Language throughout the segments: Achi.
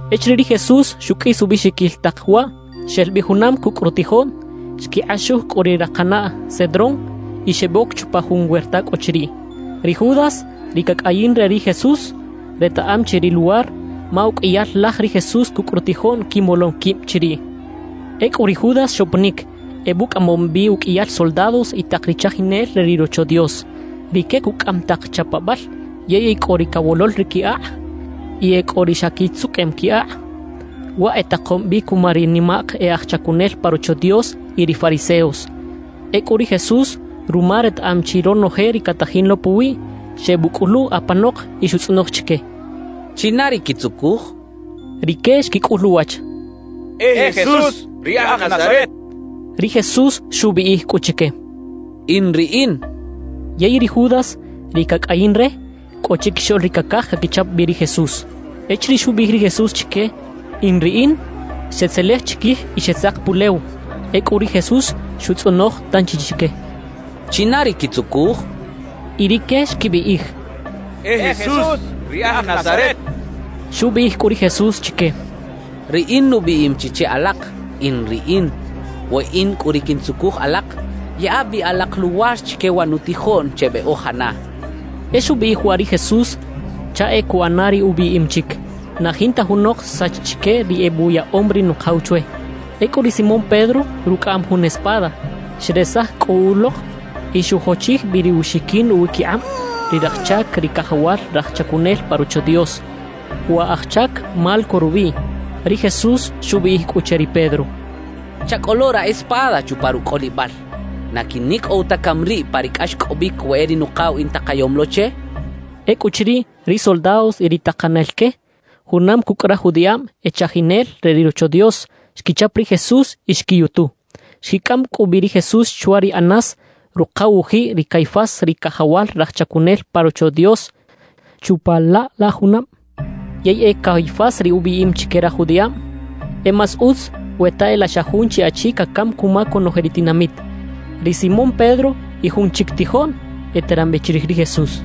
Echiriꞌ ri Jesús xuqꞌuis ubiꞌxiquil tak waꞌ, xel bi junam cucꞌ rutijoꞌn, xquikꞌaxuj cꞌu ri rakanaꞌ Cedrón y xeboc chupa jun werta cꞌo chiriꞌ. Ri Judas, ri cacꞌayin re ri Jesús, retaꞌam chi ri luwar, ma uqꞌuiyal laj ri Jesús cucꞌ rutijoꞌn quimolom quib chiriꞌ. Ecꞌu ri Judas xoponic, ebucꞌamom bi uqꞌuiyal soldados y tak ri chajinel re ri Rocho Dios. Rique cucꞌaꞌam tak chapabal, yey e cꞌo ri cawolol ri qui akꞌ y e cꞌo ri xa quitzuqꞌuem qui akꞌ. Waꞌ etakom bi cuma ri nimak e aj chacunel pa Rocho Dios y ri fariseos. Ecꞌu ri Jesús ruma retaꞌam chi ronoje ri catajin lo puwiꞌ, xebuꞌcꞌulu apanok y xutzꞌonoj chique: —¿China ri quitzucuj? —xchaꞌ. Rique xquicꞌul uwach: —E Jesús ri aj Nazaret —xechaꞌ. Ri Jesús xubiꞌij cꞌu chique: —In riꞌin —xchaꞌ. Yey ri Judas, ri cacꞌayin re, cꞌo chiquixoꞌl ri cacaj caquichap bi ri Jesús. Echiriꞌ xubiꞌij ri Jesús chique: “In riꞌin”, xetzelej chiquij y xetzak pulew. Ecꞌu ri Jesús xutzꞌonoj tanchi chique: —¿China ri quitzucuj? —xchaꞌ. Y rique xquibiꞌij: —E Jesús ri aj Nazaret —xechaꞌ. Xubiꞌij cꞌu ri Jesús chique: —Riꞌin nubiꞌim chi che alak; “In riꞌin.” We in cꞌu ri quintzucuj alak, yaꞌa bi alak luwar chique wa nutijoꞌn chebeꞌojana —xcha chique. E xubiꞌij waꞌ ri Jesús chaꞌ e cuꞌana ri ubiꞌim chic: «Na jinta junok xsach chique ri ebuyaꞌom ri Nukaw chwe.» Ecꞌu ri Simón Pedro rucꞌaꞌam jun espada. Xresaj cꞌu ulok y xujochij bi ruxiquin uwiquikꞌab ri raj chac ri cajawal raj chacunel pa Rocho Dios. Wa aj chac Malco rubiꞌ. Ri Jesús xubiꞌij cꞌu che ri Pedro: —Chacꞌolo ra espada chupa rucꞌolibal. ¿Na quinicꞌow ta cami riꞌ pa ri cꞌaxcꞌobic we e ri Nukaw intakayom lo che? —xchaꞌ. Ecꞌuchiriꞌ, ri soldados y ri takanel que, junam cucꞌ raj judiꞌab e chajinel re ri Rocho Dios, xquichap ri Jesús y xquiyutu. Xquicꞌam cꞌu bi ri Jesús chwa ri Anás, rukaw-ujiꞌ ri Caifás ri cajawal raj chacunel pa Rocho Dios chupa laꞌ la junab. Yey e Caifás ri ubiꞌim chique raj judiꞌab: «E más utz we ta e laꞌ xa jun chi achi cacam cuma conoje ri tinamit.» Ri Simón Pedro y jun chic tijoꞌn eteran bi chirij ri Jesús.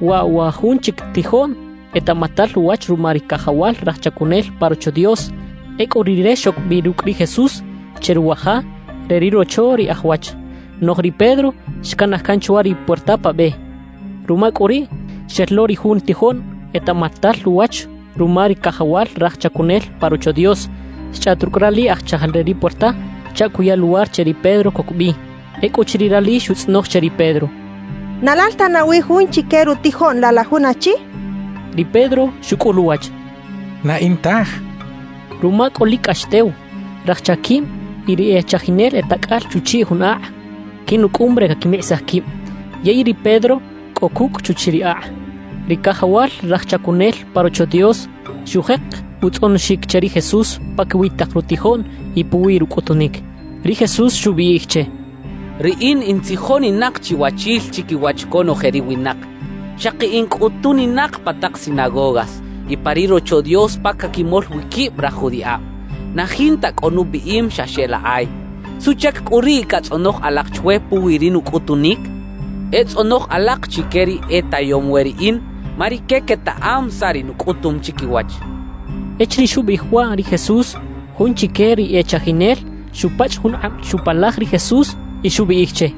Waꞌ wa jun chic tijoꞌn etaꞌmatal uwach ruma ri cajawal raj chacunel pa Rocho Dios; ecꞌu rire xoc bi rucꞌ ri Jesús che ruwa ja re ri rocho ri aj wach. Noꞌj ri Pedro xcanaj can chwa ri puerta pa be. Ruma cꞌu riꞌ, xel lo ri jun tijoꞌn etaꞌmatal uwach ruma ri cajawal raj chacunel pa Rocho Dios, xchꞌaꞌt rucꞌ rali aj chajal re ri puerta chaꞌ cuya luwar che ri Pedro coc bi. Ecꞌuchiriꞌ rali xutzꞌonoj che ri Pedro: —¿Na lal ta nawi jun chique rutijoꞌn laꞌ la jun achi? —xchaꞌ. Ri Pedro xucꞌul uwach: —Na in taj —xchaꞌ. Ruma cꞌu lic cꞌax tew, raj chaquib y ri e chajinel e tacꞌal chuchiꞌ jun akꞌ quinucꞌum re caquimikꞌisaj quib. Yey ri Pedro cꞌo cucꞌ chuchiꞌ ri akꞌ. Ri cajawal raj chacunel pa Rocho Dios xujek utzꞌonoxic che ri Jesús paquiwi tak rutijoꞌn y puwi rucꞌutunic. Ri Jesús xubiꞌij che: —Riꞌin in tzijoninak chiwachil chiquiwach conoje ri winak, xaki in cꞌutuninak pa tak sinagogas y pa ri Rocho Dios pa caquimol wi quib raj judiꞌab. Na jinta cꞌo nubiꞌim xa xeꞌlakꞌay. ¿Suꞌchac cꞌu riꞌ catzꞌonoj alak chwe puwi ri nucꞌutunic? E tzꞌonoj alak chique ri e tayom we riꞌin, ma rique quetaꞌam saꞌ ri nucꞌutum chiquiwach —xchaꞌ. Echiriꞌ xubiꞌij waꞌ ri Jesús, jun chique ri e chajinel xupachꞌ jun kꞌab chupalaj ri Jesús y xubiꞌij che: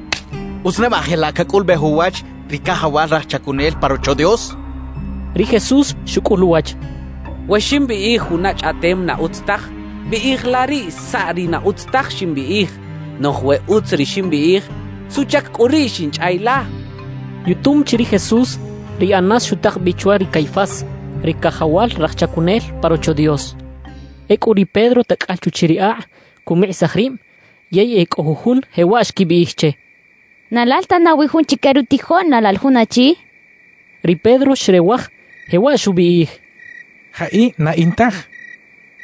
—¿Utz neba jelaꞌ cacꞌulubej uwach ri cajawal raj chacunel pa Rocho Dios? —xchaꞌ. Ri Jesús xucꞌul uwach: —We ximbiꞌij juna chꞌaꞌtem na utz taj, biꞌij la riꞌ saꞌ ri na utz taj ximbiꞌij. Noꞌj we utz ri ximbiꞌij, ¿suꞌchac cꞌu riꞌ xinchꞌay la? —xchaꞌ. Yutum chi ri Jesús, ri Anás xutak bi chwa ri Caifás, ri cajawal raj chacunel pa Rocho Dios. Ecꞌu ri Pedro tacꞌal chuchiꞌ ri akꞌ, cumikꞌisaj rib. Yey e cꞌo jujun jewaꞌ xquibiꞌij che: —¿Na lal ta nawi jun chique rutijoꞌn laꞌ la jun achi? —xechaꞌ. Ri Pedro xrewaj, jewaꞌ xubiꞌij: —¡Jaꞌi! Na in taj —xchaꞌ.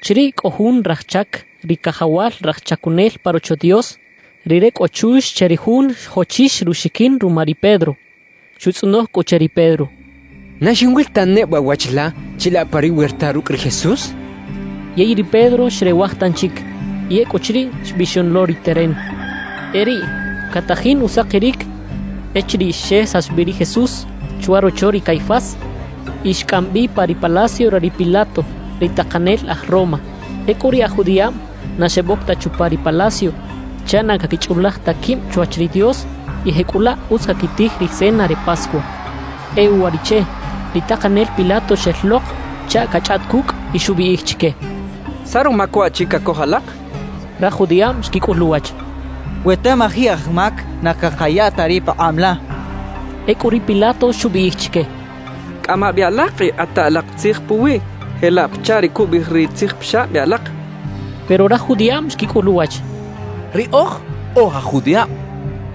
Chiriꞌ cꞌo jun raj chac ri cajawal raj chacunel pa Rocho Dios. Rire cꞌo chux che ri jun xjochix ruxiquin ruma ri Pedro. Xutzꞌonoj cꞌu che ri Pedro: —¿Na xinwil ta neba wach la chilaꞌ pa ri werta rucꞌ ri Jesús? —xchaꞌ. Yey ri Pedro xrewaj tanchic, y ecꞌuchiriꞌ xbixon lo ri teren. E riꞌ catajin usakiric echiriꞌ xesax bi ri Jesús chwa rocho ri Caifás y xcꞌam bi pa ri palacio re ri Pilato, ri takanel aj Roma. Ecꞌu ri aj judiꞌab na xeboc ta chupa ri palacio chaꞌ na caquichꞌulaj ta quib chwach ri Dios y jecꞌulaꞌ utz caquitij ri cena re Pascua. E uwariꞌche, ri takanel Pilato xel lok chaꞌ cachꞌaꞌt cucꞌ y xubiꞌij chique: —¿Saꞌ rumac waꞌchi cacoj alak? —xchaꞌ. Raj judiꞌab xquicꞌul uwach: —We tamaji aj mac, na cakaya ta riꞌ pakꞌab la —xechaꞌ. Ecꞌu ri Pilato xubiꞌij chique: —Cꞌama bi alak y kꞌata alak tzij puwiꞌ jelaꞌ pachaꞌ ri cubiꞌij ri tzijpixab e alak —xchaꞌ. Pero raj judiꞌab xquicꞌul uwach: —Riꞌoj oj aj judiꞌab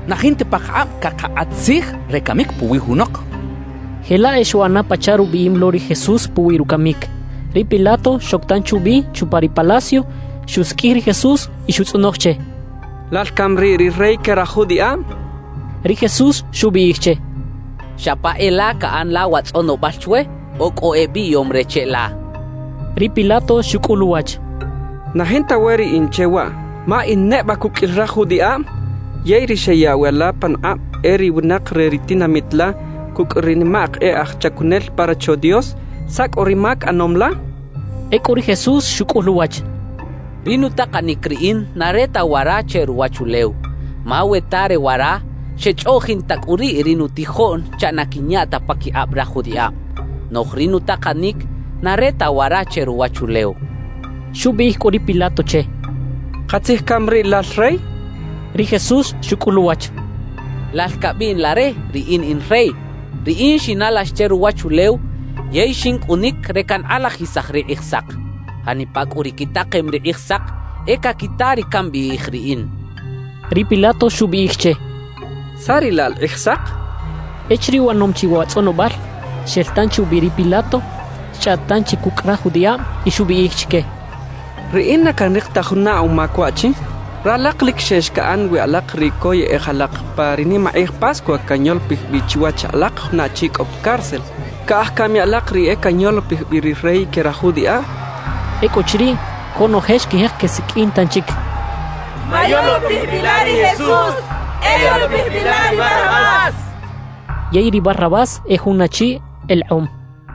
na jinta pakakꞌab cakakꞌat tzij re camic puwi junok —xechaꞌ. Jelaꞌ e xuꞌana pachaꞌ rubiꞌim lo ri Jesús puwi rucamic. Ri Pilato xoc tanchi ubi chupa ri palacio, xusiqꞌuij ri Jesús y xutzꞌonoj che: —¿Lal cami riꞌ ri rey que raj judiꞌab? —xchaꞌ. Ri Jesús xubiꞌij che: —¿Xa pa e la caꞌan la wa tzꞌonobal chwe o cꞌo ebiꞌyom re cheꞌla? —xchaꞌ. Ri Pilato xucꞌul uwach: —Na jinta we riꞌin che waꞌ, ma ¿in neba cuqꞌuil raj judiꞌab? Yey ri xeyaꞌw e la panukꞌab e ri winak re ri tinamit la cucꞌ ri nimak e aj chacunel pa Rocho Dios. ¿Saꞌ cꞌu ri mac ꞌanom la? —xchaꞌ. Ecꞌu ri Jesús xucꞌul uwach: —Ri nutakanic riꞌin na re ta wara che ruwachulew. Ma we ta re wara, xechꞌoꞌjin ta cꞌu riꞌ ri nutijoꞌn chaꞌ na quinyaꞌ ta paquikꞌab raj judiꞌab. Noꞌj ri nutakanic na re ta wara che ruwachulew —xchaꞌ. Xubiꞌij cꞌu ri Pilato che: —¿Katzij cami riꞌ lal rey? —xchaꞌ. Ri Jesús xucꞌul uwach: —Lal cabiꞌn la re, riꞌin in rey. Riꞌin xinalax che ruwachulew yey xincꞌunic re cankꞌalajisaj ri Kꞌijsak. Janipa cꞌu ri quitakem ri Kꞌijsak, e caquita ri cambiꞌij riꞌin —xchaꞌ. Ri Pilato xubiꞌij che: —¿Saꞌ riꞌ laꞌ la Kꞌijsak? —xchaꞌ. Echiriꞌ uꞌanom chi wa tzꞌonobal, xel tanchi ubi ri Pilato, xchꞌaꞌt tanchi cucꞌ raj judiꞌab y xubiꞌij chique: —Riꞌin na canrik ta juna umac waꞌchi. Ralak lic xex caꞌan wi alak ri coyꞌej alak pa ri nimakꞌij Pascua canyolopij bi chiwach alak juna achi cꞌo pa cárcel. ¿Caꞌaj cami alak riꞌ e canyolopij bi ri rey que raj judiꞌab? —xchaꞌ. Ecꞌuchiriꞌ, conoje xquijek quesiqꞌuin tanchic: —¡Mayolopij bi la ri Jesús! ¡E yolopij bi la ri Barrabás! —xechaꞌ. Yey ri Barrabás e jun achi elekꞌom.